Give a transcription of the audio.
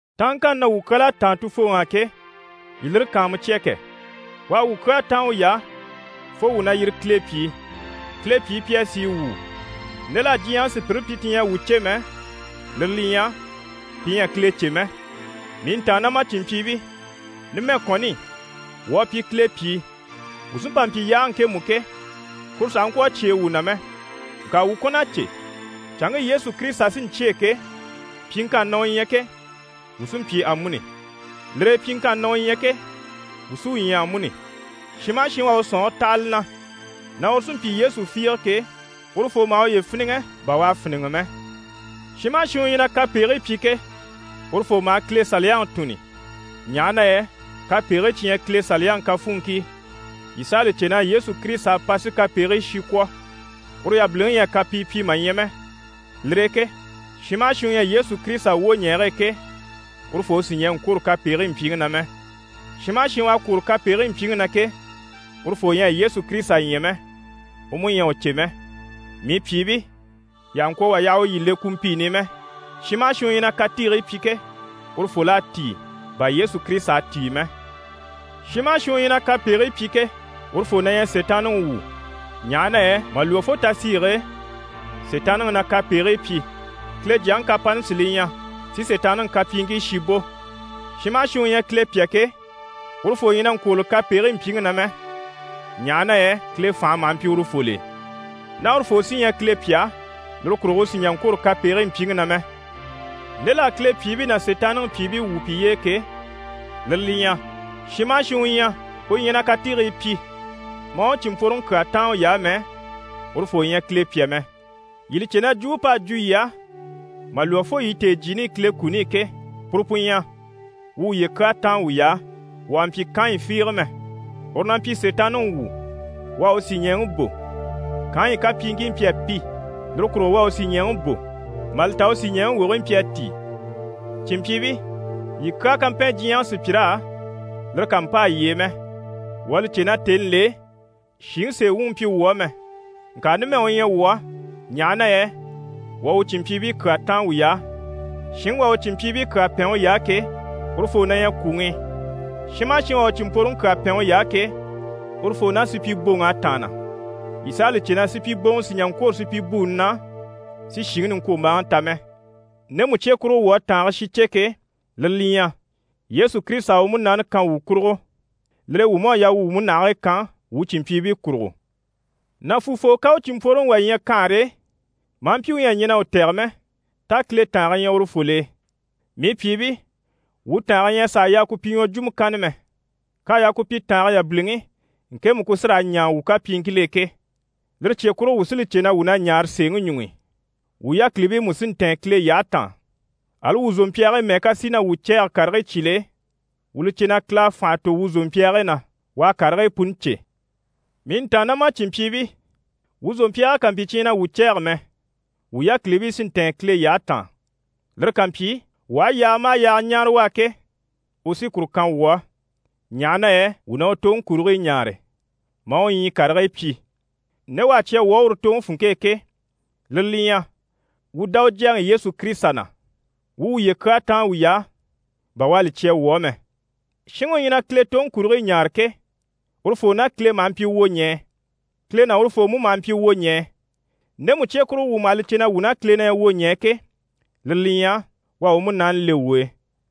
Táanŋkanni na wuu kyal'à táan Tufooŋi á ke, yii lire kàanmucya kɛ! U à wuu kyaa táan uy'á fo wuu na yire Kile pyìi. Kile pyìi pi à sìi wuu. Nde l'à diɲyɛŋi sùpyire pyi ti ɲyɛ a wuu cè mɛ, lire li ɲyɛ: pi ɲyɛ a Kile cè mɛ. Mii ntàannamacinmpyiibii, numɛ kɔni, wuu à pyi Kile pyìi. Wuu sí n‑pa n‑pyi yaage ŋkemu ke, kuru sàha ŋkwɔ̀ a cyêe wuu na mɛ. Ŋka wuu kɔn'à cè, canŋke Yesu Kirisita sí n‑cyêe ke, pyiŋkanni na u ɲyɛ ke, wuu sí n‑pyi amuni. Lire e, pyiŋkanni na u ɲyɛ ke, wuu sí u ɲya amuni. Shin maha shin u à u sɔ̀nŋɔre taha li na na uru sí n‑pyi Yesu fiige ke, urufoo maha uye fíniŋɛ bà u à fíniŋɛ mɛ. Shin maha shin u ɲyɛ na kapegigii pyi ke, urufoo maha Kile Saliyaŋi tùnni, ɲaha na yɛ kapegigii cyi ɲyɛ Kile Saliyaŋi kafuunŋkii. Yii s'a li cè na Yesu Kirisita à pa si kapegigii shi kwɔ̀. Uru yabiliŋi ɲyɛ a kapii pyi mà ɲya mɛ. Lire e ke shin maha shin u ɲyɛ Yesu Kirisita wwoɲɛɛge e ke, urufoo sì ɲɛɛ n‑kwôro kapegigii mpyiŋi na mɛ. Shin maha shin u à kwôro kapegigii mpyiŋi na ke, urufoo ɲyɛ a Yesu Kirisita ɲya mɛ, u mú ɲyɛ a u cè mɛ. Mii pyìibii, yii àha ŋkwɔ̀ wà yaha u yii le kumpiini i mɛ. Shin maha shin u ɲyɛ na katiigii pyi ke, urufol'à tíi bà Yesu Kirisita à tíi mɛ. Shin maha shin u ɲyɛ na kapegigii pyi ke, urufoo na ɲyɛ Sitaanniŋi wu, ɲaha na yɛ mà lwɔ́ fo tasiige e, Sitaanniŋi na kapegigii pyi. Kile Jyaŋi kapani sí li ɲyɛ si Sitaanniŋi kapyiiŋkii shi bò. Shin maha shin u ɲyɛ Kile pyà ke, urufoo ɲyɛ na ŋkwôroli kapegigii mpyiŋi na mɛ, ɲaha na yɛ Kile fànhe maha mpyi urufol'e. Ná urufoo sí ɲyɛ Kile pyà, lire kurugo u sì n‑jà n‑kwôro kapegigii mpyiŋi na mɛ. Nde l'à Kile pyìibii ná Sitaanniŋi pyìibii wwû piye e ke, lire li ɲyɛ: shin maha shin u ɲyɛ u ɲyɛ na katiigii pyi, maa u cìnmpworoŋi kyaa táan uy'á mɛ, urufoo ɲyɛ Kile pyà mɛ. Yii li cè na jwumpe p'à jwo yii á mà lwɔ́ fo yii tèejyiini i Kile kuni i ke, puru pu ɲyɛ: wuu wuye kyaa táan wuy'á. Wuu àha mpyi Kanɲi fiige mɛ, uru na mpyi Sitaanniŋi wu, u à u sìɲɛɛŋi bò. Kanɲi kapyiiŋkii mpyi a pi, lire kurugo u à u sìɲɛɛŋi bò, mà li ta u sìɲɛɛŋi wogigii mpyi a tíi. Cìnmpyiibii, yii kyaa ká mpɛn diɲyɛŋi sùpyir'á, lire kà mpâa yii e mɛ. Wuu à li cè na tèni l'e shìŋi sèe wuŋi mpyi wuu á mɛ. Ŋka numɛ u ɲyɛ wuu á, ɲaha na yɛ wuu à wuu cìnmpyiibii kyaa táan wuy'á. Shinŋi u à u cìnmpyiibii kyaa pɛn uy'á ke, urufoo na ɲyɛ kwùŋi i. Shin maha shin u à u cìnmpworoŋi kyaa pɛn uy'á ke, urufoo ná supyiboŋ'à tàanna. Yii s'à li cè na supyiboŋɔ sì n‑jà n‑kwôro supyibuuni na, si shìŋi niŋkwombaaŋi ta mɛ. Ndemu cye kurugo wuu à tàange shi cè ke, lire li ɲyɛ: Yesu Kirisita à u múnaani kan wuu kurugo. Lire e wuu mú à yaa wuu wuu múnahigii kan wuu cìnmpyiibii kurugo. Nàfuufoo ká u cìnmpworoŋi wà ɲya kanhare e, maa mpyi u ɲyɛ a ɲɛn'a u tɛ̀gɛ mɛ, tá Kile tàange ɲyɛ urufol'e? Mii pyìibii, wuu tàange ɲyɛ a sàa yaa ku pyi ɲwɔjwumɔ kanna mɛ. K'à yaa ku pyi tàange yabiliŋi, ŋkemu ku sí raa ɲaa wuu kapyiiŋkil'e ke. Lire cye kurugo, wuu sí li cè na wuu na ɲaare sèeŋi ɲuŋ'i, wuu yákilibii mú sí n‑tɛ̀ɛn Kile yyahe taan. Ali wuu zòmpyaagii mɛ́ɛ ká sìi na wuu cɛ̂ɛge karigii cyìl'e, wuu li cè na Kile à fànha tò wuu zòmpyaagii na, u à karigii puni cè. Mii ntàannamacinmpyiibii, wuu zòmpyaagii ká mpyi cyi ɲyɛ na wuu cɛ̂ɛge mɛ, wuu yákilibii sí n‑tɛ̀ɛn Kile yyahe taan. Lire ká mpyi, wuu aha yaaga maha yaaga ɲáare u á ke, u sí kuru kan wuu á, ɲaha na yɛ wuu na u toŋi kurigii ɲaare, maa u ɲyii karigii pyi. Nde u à cya wuu á uru toŋi funŋke e ke, lire li ɲyɛ: wuu dá u Jyaŋi Yesu Kirisita na, wuu u wuye kyaa táan wuy'á bà u à li cya wuu á mɛ. Shinŋi u ɲyɛ na Kile toŋi kurigii ɲaare ke, urufoo ná Kile maha mpyi wwoɲɛɛ, Kile ná urufoo mú maha mpyi wwoɲɛɛ. Ndemu cye kurugo wuu maha li cè na wuu ná Kile ɲyɛ wwoɲɛɛ ke, lire li ɲyɛ: u à u Munaani le wuu e.